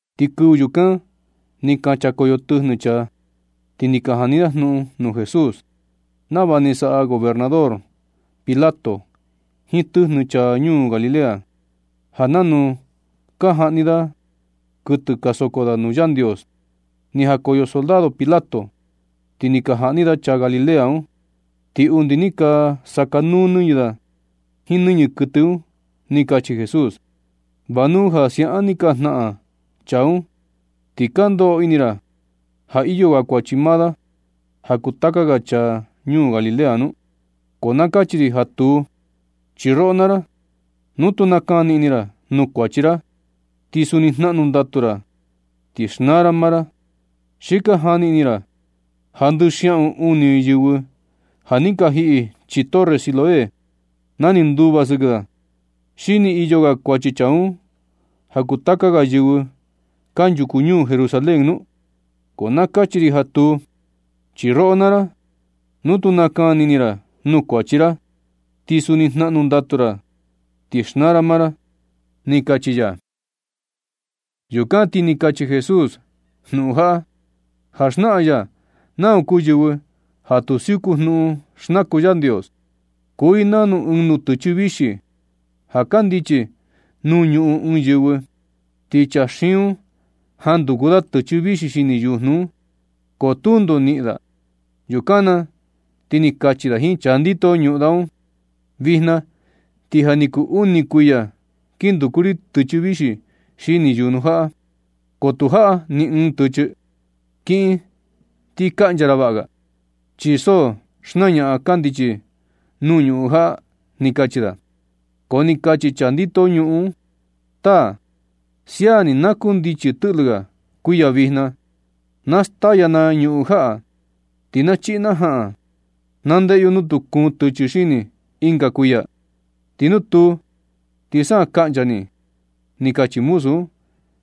Ti kɨvɨ yukan ni ka chakoyo tɨjnɨ chaa, ti ni ka jani da jnuꞌun nuu Jesús nava ni saꞌa gobernador Pilato jiin tɨjnɨ chaa ñuu Galilea, ja nanu ka jaꞌni da kuɨtɨ ja soko da nuu Yandios ni jakoyo soldado Pilato ti ni ka jaꞌni da chaa Galilea un, ti undi ni ka nasakanuu nɨñɨ da jiin nɨñɨ kuɨtɨ un. Ti ni kachi Jesús: ―Va nu ja siaꞌan ni ka jnaꞌan chaa un, ti ka ndoꞌo ini ra ja iyo ga kuachi maa da ja kuu taka ga chaa ñuu Galilea un. Ko na kachi ri ja tuu. Chi roꞌo naa ra, nu tu nakani ini ra nuu kuachi ra, ti suni jnaꞌnu ndatu ra ti xnaa ra maa ra. ¿Xi ka jani ini ra ja ndɨꞌɨ xiaꞌun uni yɨvɨ ja ni ka jiꞌi chii torre Siloé na ni nduva sɨkɨ da, xi ni iyo ga kuachi chaa un ja kuu taka ga yɨvɨ kanchuku ñuu Jerusalén nu? Ko na kachi ri ja tuu. Chi roꞌo naa ra, nu tu nakani ini ra nuu kuachi ra, ti suni jnaꞌnu ndatu ra ti xnaa ra maa ra ―ni kachi ya. Yukan ti ni kachi Jesús jnuꞌun jaꞌa, ja xnaꞌan ya nau kuu yɨvɨ ja tu siuku jnuꞌun xndaku Yandios: ―Kuu i nanu ɨɨn nutɨchɨ vixi ja kandichi nuu ñuꞌun ɨɨn yɨvɨ, ti chaa xiin un jan nduku da tɨchɨ vixi xini yujnu un, ko tundo niꞌin da. Yukan na ti ni kachi da jiin chaa ndito ñuꞌun da un: “Vijna ti ja ni kuu uni kuiya kin nduku ri tɨchɨ vixi xini yujnu jaꞌa, ko tu jaꞌa ni ɨɨn tɨchɨ. Kiꞌin ti kaꞌncha ra vaꞌa ga, chi so xnañaꞌan kandichi nuu ñuꞌun jaꞌa”, ni kachi da. Ko ni kachi chaa ndito ñuꞌun un: “Taa, sia ni na kundichi tɨꞌlɨ ga kuiya vijna, na staya na ñuꞌun jaꞌa, ti na chiꞌi na jaꞌan. Na ndeꞌe yo nu tu kuun tɨchɨ xini ɨnga kuiya. Ti nu tuu, ti sa kaꞌncha ni”, ni kachi muzu un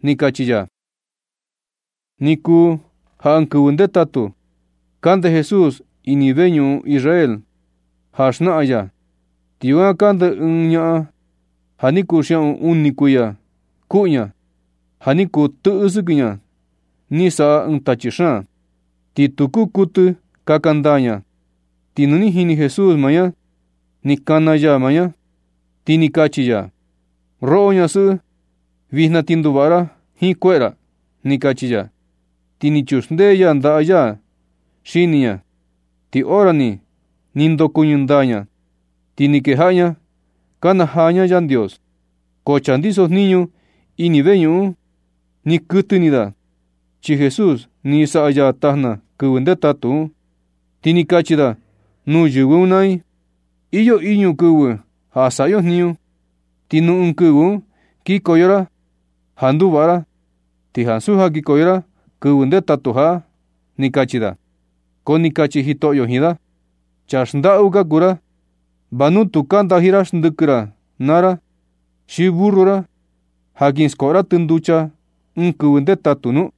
―ni kachi ya. Ni kuu ja ɨɨn kɨvɨ ndetatu, kande Jesús ini ɨɨn veñuꞌun Israel ja xnaꞌan ya, ti yukan kande ɨɨn ñaꞌan ja, ja ni kuu xiaꞌun uni kuiya kuꞌu ña. Ja ni kuu tɨꞌɨ sɨkɨ ña ni saꞌa ɨɨn tachi xaan, ti tu kuu kuɨtɨ kaka ndaa ña. Ti nu ni jini Jesús maa ña, ni kana ya ña, ti ni kachi ya: ―Roꞌo ñasɨꞌɨ, vijna ti nduvaꞌa ra jiin kueꞌe ra ―ni kachi ya. Ti ni chuxndee ya ndaꞌa ya xini ña, ti hora ni, ni ndokuɨñɨ ndaa ña. Ti ni kejaꞌa ña nakanajaa ña Yandios. Ko chaa ndiso jniñu ini veñuꞌun un, ni kuɨtɨ ini da, chi Jesús ni saꞌa ya tajna kɨvɨ ndetatu un. Ti ni kachi da nuu yɨvɨ un naa i: ―Iyo iñu kɨvɨ ja saꞌa yo jniñu, ti nuu ɨɨn kɨvɨ un kikoyo ra ja nduvaꞌa ra, ti ansu ja kikoyo ra kɨvɨ ndetatu jaꞌa ―ni kachi da. Ko ni kachi Jitoꞌyo jiin da: ―Chaa xndaꞌu ka kuu ra. ¿Va nu tu ka ndaji ra xndɨkɨ ra naa ra xi burru ra ja kin skoꞌo ra tɨ nducha ɨɨn kɨvɨ ndetatu nu?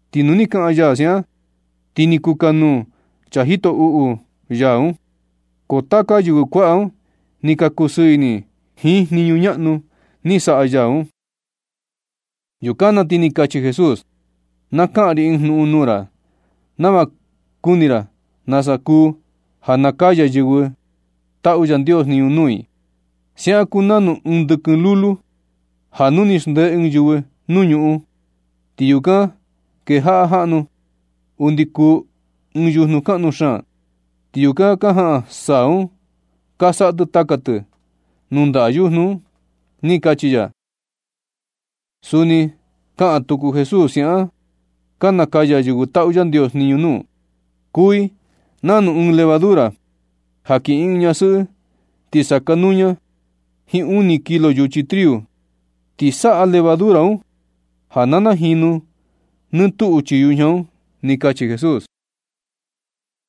Ti nu ni kaꞌan ya siaꞌan, ti ni kukanuu chaa jito uꞌu ya un, ko taka ga yɨvɨ kuaꞌa un ni ka kusɨɨ ini jiin jniñu ñaꞌnu ni saꞌa ya un. Yukan na ti ni kachi Jesús: ―Na kaꞌan ri ɨɨn jnuꞌun nuu ra nava kuni ra nasa kuu ja ka nakaya yɨvɨ taꞌu Yandios jniñu nuu i. Siaꞌan kuu nanu ɨɨn ndɨkɨn lulu, ja nu ni xndee ɨɨn yɨvɨ nuu ñuꞌun i, ti yukan kejaꞌa jaꞌnu undi kuu ɨɨn yujnu kaꞌnu xaan, ti yukan ka jaꞌan saa un ka saꞌa tɨ taka tɨ nuu ndaꞌa yujnu un ―ni kachi ya. Suni ni kaꞌan tuku Jesús: ―Siaꞌan ka nakaya yɨvɨ taꞌu Yandios jniñu nuu. Kuu i nanu ɨɨn levadura ja kiꞌin ɨɨn ñasɨꞌɨ ti sakanuu ña jiin uni kilo yuchi triu, ti saꞌa levadura un ja na najinu nɨ tuꞌu chii yujña un ―ni kachi Jesús.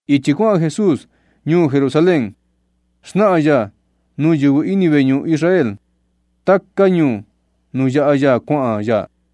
Ichi kuaꞌan Jesús ñuu Jerusalén xnaꞌan ya nuu yɨvɨ ini veñuꞌun Israel taka ñuu nuu yaꞌa ya kuaꞌan ya.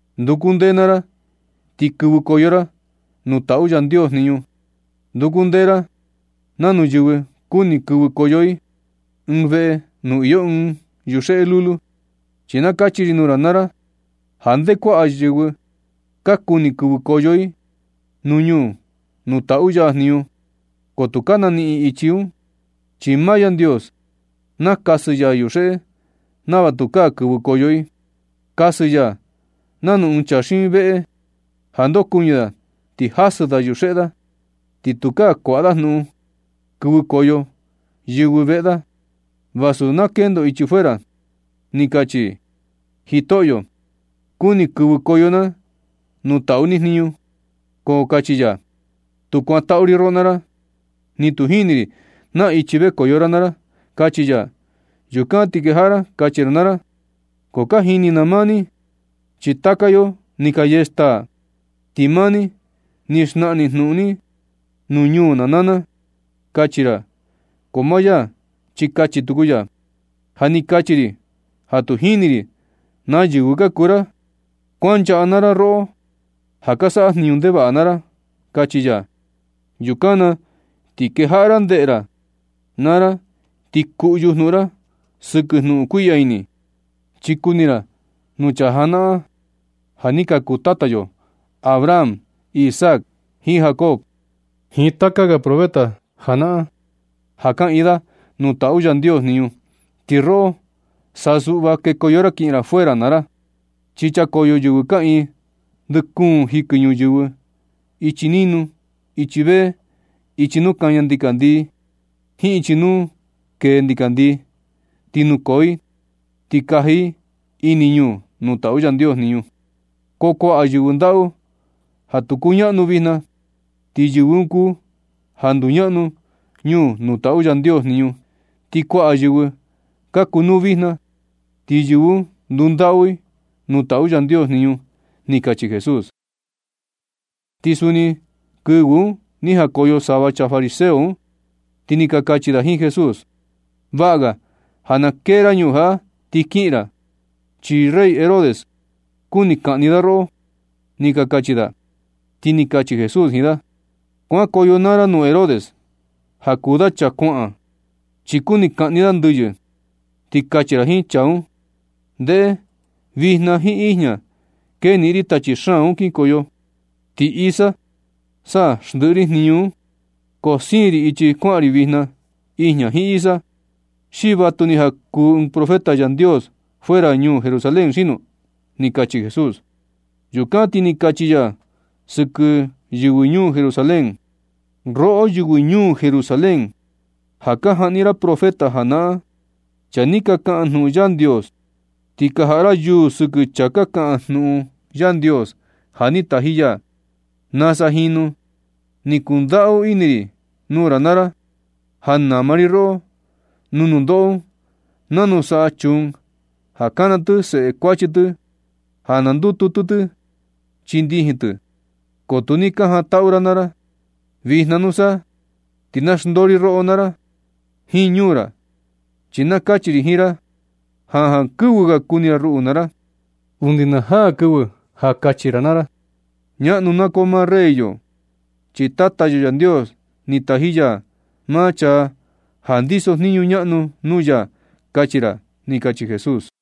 ―Nduku ndee naa ra ti kɨvɨkoyo ra ñuu nuu taꞌu Yandios jniñu. Nduku ndee ra nanu yɨvɨ kuni kɨvɨkoyo i ɨɨn veꞌe nuu iyo ɨɨn yuxeꞌe lulu. Chi na kachi ri nuu ra naa ra ja nde kuaꞌa yɨvɨ ka kuni kɨvɨkoyo i ñuu nuu taꞌu ya jniñu, ko tu ka naniꞌin i ichi, chi maa Yandios nakasɨ ya yuxeꞌe nava tukaa kɨvɨkoyo i. Kasɨ ya nanu ɨɨn chaa xiin veꞌe ja ndokuɨñɨ da ti kasɨ da yuxeꞌe da, ti tukaa kuaꞌa da jnuꞌun kɨvɨkoyo yɨvɨ veꞌe da. Vasu na kendo i ichi fuera ti kachi i: “Jitoꞌyo, kuni kɨvɨkoyo na nuu taꞌu ni jniñu.” Ko kachi ya: “Tu kuantaꞌu ri roꞌo naa ra, ni tu jini ri naa ichi vekoyo ra naa ra”, kachi ya. Yukan ti kejaꞌa ra kachi ra naa ra: “Ko ka jini na maa ni, chi taka yo ni ka yee staa, ti maa ni, ni xnaꞌan ni jnuꞌun ni nuu ñuu na naa na”, kachi ra. Ko maa ya chi kachi tuku ya: “Ja ni kachi ri ja tu jini ri naa yɨvɨ ka kuu ra. Kuanchaꞌa naa ra, roꞌo ja ka saꞌa jniñu ndevaꞌa naa ra”, kachi ya. Yukan na ti kejaꞌa ra ndeꞌe ra naa ra ti kuꞌyu jnuꞌun ra sɨkɨ jnuꞌun kuiꞌya ini. Chi kuni ra nuu chaa janaꞌan, ja ni ka kuu tata yo, Abraham, Isaac, jiin Jacob jiin taka ga profeta janaꞌan ja kaꞌiin da nuu taꞌu Yandios jniñu, ti roꞌo sa suꞌva kekoyo ra kiꞌin ra fuera naa ra. Chi chakoyo yɨvɨ kaꞌiin ndɨ kuun jikɨ ñuyɨvɨ, ichi ninu, ichi vee, ichi nuu kaña ndikandii, jiin ichi nuu kee ndikandii, ti nukoo i ti kaji i ini ñuu nuu taꞌu Yandios jniñu. Ko kuaꞌa yɨvɨ ndaꞌu ja tu kuñaꞌnu vijna, ti yɨvɨ un kuu ja nduñaꞌnu ñuu nuu taꞌu Yandios jniñu. Ti kuaꞌa yɨvɨ ka kunuu vijna, ti yɨvɨ un ndundaꞌu i nuu taꞌu Yandios jniñu ―ni kachi Jesús. Ti suni kɨvɨ un ni jakoyo sava chaa fariseo un, ti ni ka kachi da jiin Jesús: ―Vaꞌa ga ja na kee ra ñuu jaꞌa ti kiꞌin ra, chi rey Herodes kuni kaꞌni da roꞌo ―ni ka kachi da. Ti ni kachi Jesús jiin da: ―Kuankoyo naa ra nuu Herodes, ja kuu da chaa kuaꞌan, chi kuni kaꞌni da ndɨyɨ, ti kachi ra jiin chaa un: “Ndeꞌe, vijna jiin ijña keniꞌin ri tachi xaan un kinkoyo, ti isa sa xndiꞌi ri jniñu un.” Ko siin ri ichi kuaꞌan ri vijna, ijña, jiin isa, ¿xi vatuni ja kuū ɨɨn profeta Yandios fuera ñuu Jerusalén xino? ―ni kachi Jesús. Yukan ti ni kachi ya sɨkɨ yɨvɨ ñuu Jerusalén: ―Roꞌo, yɨvɨ ñuu Jerusalén, ja ka jaꞌni ra profeta najanaꞌan, chaa ni kaꞌan jnuꞌun Yandios, ti ka jaꞌa ra yuu sɨkɨ chaa ka kaꞌan jnuꞌun Yandios ja ni taji ya. Nasa jinu ni kundaꞌu ini ri nuu ra naa ra, ja nama ri roꞌo nuu nundoꞌo un nanu saꞌa chuun ja kana tɨ seꞌe kuachi tɨ ja na ndututu chii ndijin tɨ, ko tu ni ka jantaꞌu ra naa ra. Vijna na nusa, ti na xndoo ri roꞌo naa ra jiin ñuu ra. Chi na kachi ri jiin ra ja jankɨvɨ ga kuni ra ruꞌu naa ra undi na jaa kɨvɨ ja kachi ra naa ra: “Ñaꞌnu na koo maa rey yo, chi Tata yo Yandios ni taji ya maa chaa ja ndiso jniñu ñaꞌnu nuu ya”, kachi ra ―ni kachi Jesús.